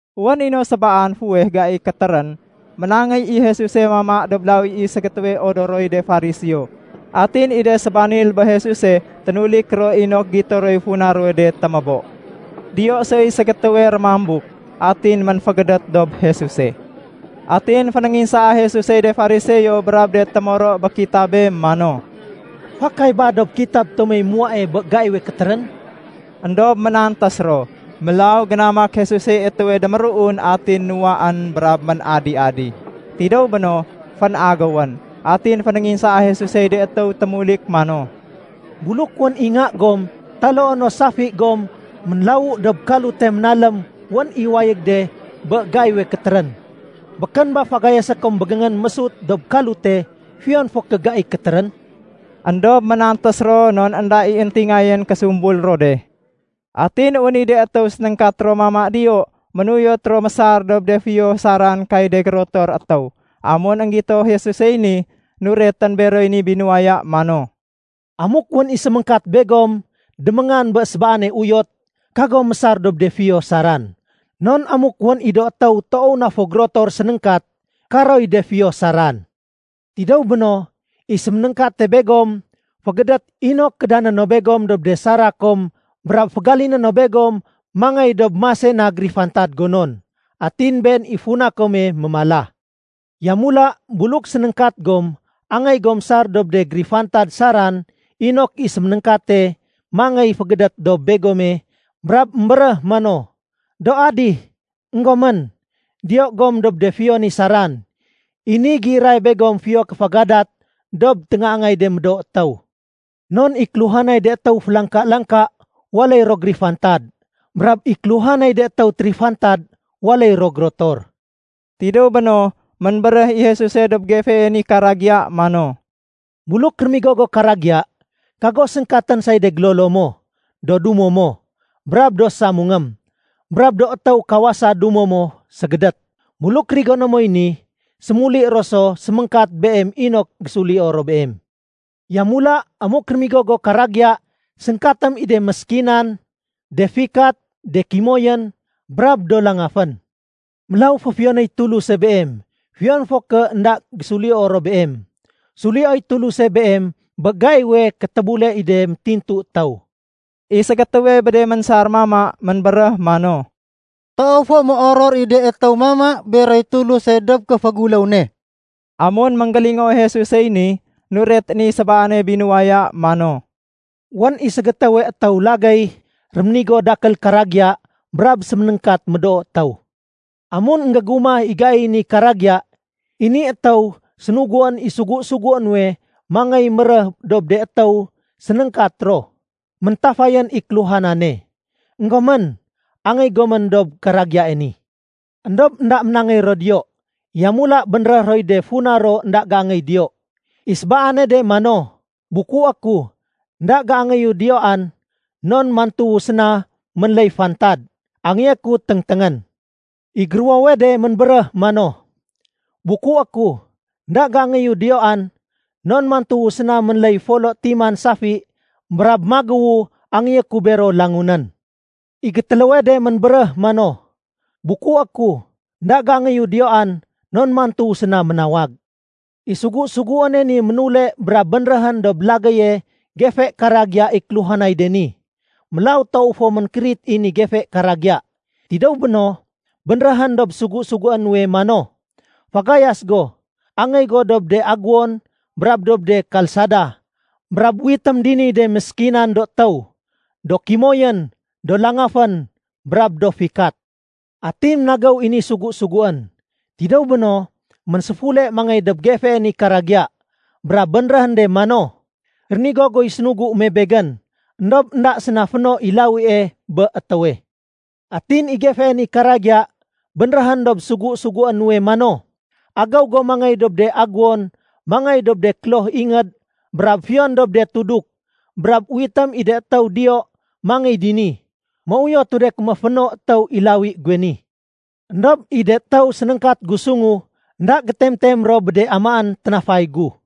Wén i no sébaan fuweh gai kétérén, ménangéy i Jesuse mama dob lawi i ségétéwe odoroy de Fariseo. Atin i de sébanil bé Jesuse ténulik ro inok gito roy funa ruwe de témébo. Diyo soy ségétéwe rémambuk. Atin ménfégédét dob Jesuse. Atin fénénginsaa Jesusey de Fariseo brab de témoro bé kitabé mano, “Fakay ba dob kitab tomey muwae bé gaiwe kétérén?” Endob ménantés ro. Mélaw génamak Jesusey étéwe déméruun atin nuwaén brab ménadi-adi. Tidéw béno, fénagéwén. Atin fénénginsaa Jesusey de étéw témulik mano, “Buluk wén i nga gom taloo no safi gom ménlawu dob kalute ménalém wén i wayég de bé gaiwe kétérén, békén ba fagayasé kom bégéngén mésut dob kalute fiyon fo ké gai kétérén?” Endob ménantés ro non énda i éntingayén késumbul ro de. Atin wén i de étéw sénéngkat ro mama diyo ménuyot ro mésar dob de fiyo saran kay de gérotor étéw. Amun énggito Jesusey ni, nuretén beroy ni binuwaya mano, “Amuk wén i séméngkat begom déméngan bé sébaane uyot, kagom mésar dob de fiyo saran, non amuk wén i do étéw toow na fo gérotor sénéngkat, karoy de fiyo saran. Tidéw béno, i séménéngkate begom fégédét inok kédané no begom dob de sara kom brab fégaliné no begom mangéy dob mase na gérifantad gonon. Atin been i funa kome mémala. Yamula, buluk sénéngkat gom, angéy gom sar dob de gérifantad saran inok i séménéngkate mangéy fégédét dob begome brab émbéréh mano, ‘Do adih, énggomén, diyo gom dob de fiyo ni saran.’ I ni géiray begom fiyo kéfégadat dob téngaangay de médoo étéw. Non i kéluhanay de étéw félangka-langka waléy ro gérifantad. Brab i kéluhanay de étéw térifantad waléy ro gérotor.” Tidéw béno, ménbéréh i Jesuse dob gefee ni karagiya mano, “Buluk rémigo go karagiya, kago séngkatén say de gélolo mo, do dumo mo, brab do samungém, brab do étéw kawasa dumo mo ségédét. Buluk rigoné moy ni, sémuli ro so séméngkat beem inok gésulio ro beem. Yamula, amuk rémigo go karagiya, séngkatém i de méskinan, de fikat, de kimoyén, brab do langafén. Mélaw féfiyonéy Tuluse beem fiyon fo ké énda gésulio ro beem. Sulioy Tuluse beem bé gaiwe kétébule i de métintu étéw.” I ségétéwe bé de ménsar mama, ménbéréh mano, “Toow fo méoror i de étéw mama beroy Tuluse dob kéféguléw ne.” Amun énggélingoo Jesusey ni, nuretén i sébaane binuwaya mano, “Wén i ségétéwe étéw lagéy réménigo dakél karagiya brab séménéngkat médoo étéw. Amun énggégumah i gaiy ni karagiya, i ni étéw sénuguén i sugu-sugué nuwe mangéy méréh dob de étéw sénéngkat ro, ‘Méntafayén i kéluhanane. Enggomén, angéy gomén dob karagiyae ni.’ Endob énda ménangéy ro diyo. Yamula bénréh roy de funa ro énda géangéy diyo. I sébaane de mano, ‘Bukué ku, énda géangéyu diyoan, non mantuwu séna ménléy fantad, angéyé ku téngténgén.’ I géruwowe de ménbéréh mano, ‘Bukué ku, énda géangéyu diyoan, non mantuwu séna ménléy folo timan safi brab magéwu angéyé ku bero langunén.’ I gétéléwe de ménbéréh mano, ‘Bukué ku, énda géangéyu diyoan, non mantuwu séna ménawag.’ I sugu-suguéne ni ménule brab bénréhén dob lagéye gefe karagiya i kéluhanay de ni. Mélaw toow fo ménkérit i ni gefe karagiya. Tidéw béno, bénréhén dob sugu-sugué nuwe mano, ‘Fagayas go, angéy go dob de agéwon brab dob de kalsada, brab uwitém diniy de méskinan do étéw, do kimoyén, do langafén, brab do fikat.’ Atin ménagéw i ni sugu-suguén. Tidéw béno, ménséfule mangéy dob gefee ni karagiya, brab bénréhén de mano, ‘Rénigo guy sénugu me begén, éndob énda séna féno i lawie bé étéwe.’ Atin i gefee ni karagiya bénréhén dob sugu-sugué nuwe mano, ‘Agéw go mangéy dob de agéwon mangéy dob de kloh ingéd brab fiyon dob de tuduk, brab uwitém i de étéw diyo mangéy dini, méuyotu de ké méféno étéw i lawi guwe ni. Endob i de étéw sénéngkat gu sungu, énda gétem-tem ro bé de amaén ténafay gu.’”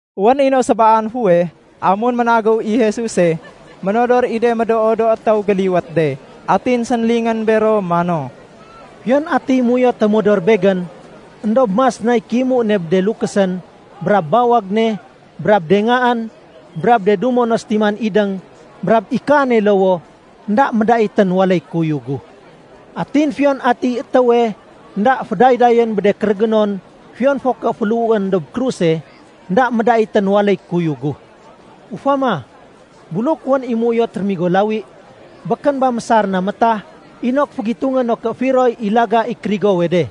Wén i no sébaan fuweh, amun ménagéw i Jesuse, ménodor i de médoo do étéw géliwét de. Atin sénlingén bero mano, “Fiyon atiy méuyote modor Begén, éndob mas nay kéimu ne bé de lukésén, brab bawag ne, brab de ngaén, brab de dumo no sétiman idéng, brab i kaane lowoh, énda médaitén waléy kuyug gu. Atin fiyon atiy étéwe énda fédaydayén bé de kérégénon fiyon fo ké féléhuén dob kruse, énda médaitén waléy kuyug gu. Ufama, buluk wén i méuyot rémigo lawi, békén ba mésar na métah inok fégitungé no ké firoy i laga i kérigowe de,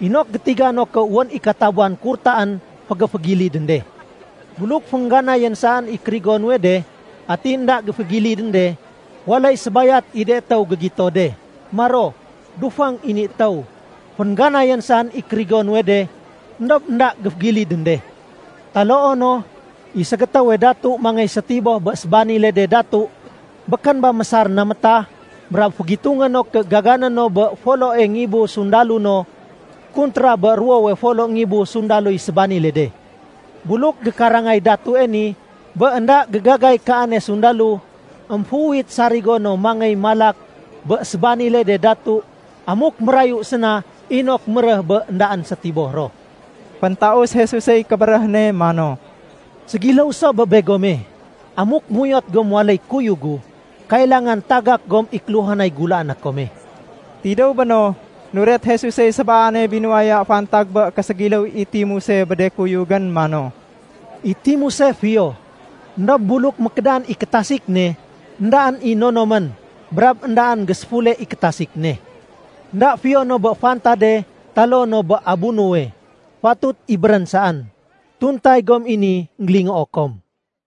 inok gétiga no ké wén i katabuwan kurtaén fégéfégilidén de? Buluk féngganayén saén i kérigo nuwe de, atin énda géfégilidén de, waléy sébayat i de étéw gégito de. Maro, ‘Dufang i ni étéw. Féngganayén saén i kérigo nuwe de, éndob énda géfégilidén de.’ Taloo no, i ségétéwe datu mangéy sétiboh bé sébanile de datu. Békén ba mésar na métah brab fégitungé no ké gagané no bé foloé ngibu sundalo no kuntra bé ruwowe folo ngibu sundaloy sébanile de? Buluk gékarangay datue ni bé énda gégagay kaane sundalo, émféuwit sarigo no mangéy malak bé sébanile de datu amuk mérayu séna inok méréh bé éndaén sétiboh ro.” Féntaus Jesusey kébéréh ne mano, “Ségiléw so bé begome. Amuk méuyot gom waléy kuyug gu, kailangan tagak gom i kéluhanay gulaané kome.” Tidéw béno, nuret Jesusey sébaane binuwaya fantag bé késégiléw i timuse bé de kuyugén mano, “I timuse fiyo. Endob buluk mékédan i kétasik ne, éndaén i nonomén brab éndaén géséfule i kétasik ne. Enda fiyo no bé fantade taloo no bé abunowe. Fatut ibérén saén. Tuntay gom i ni énggélingoo kom.”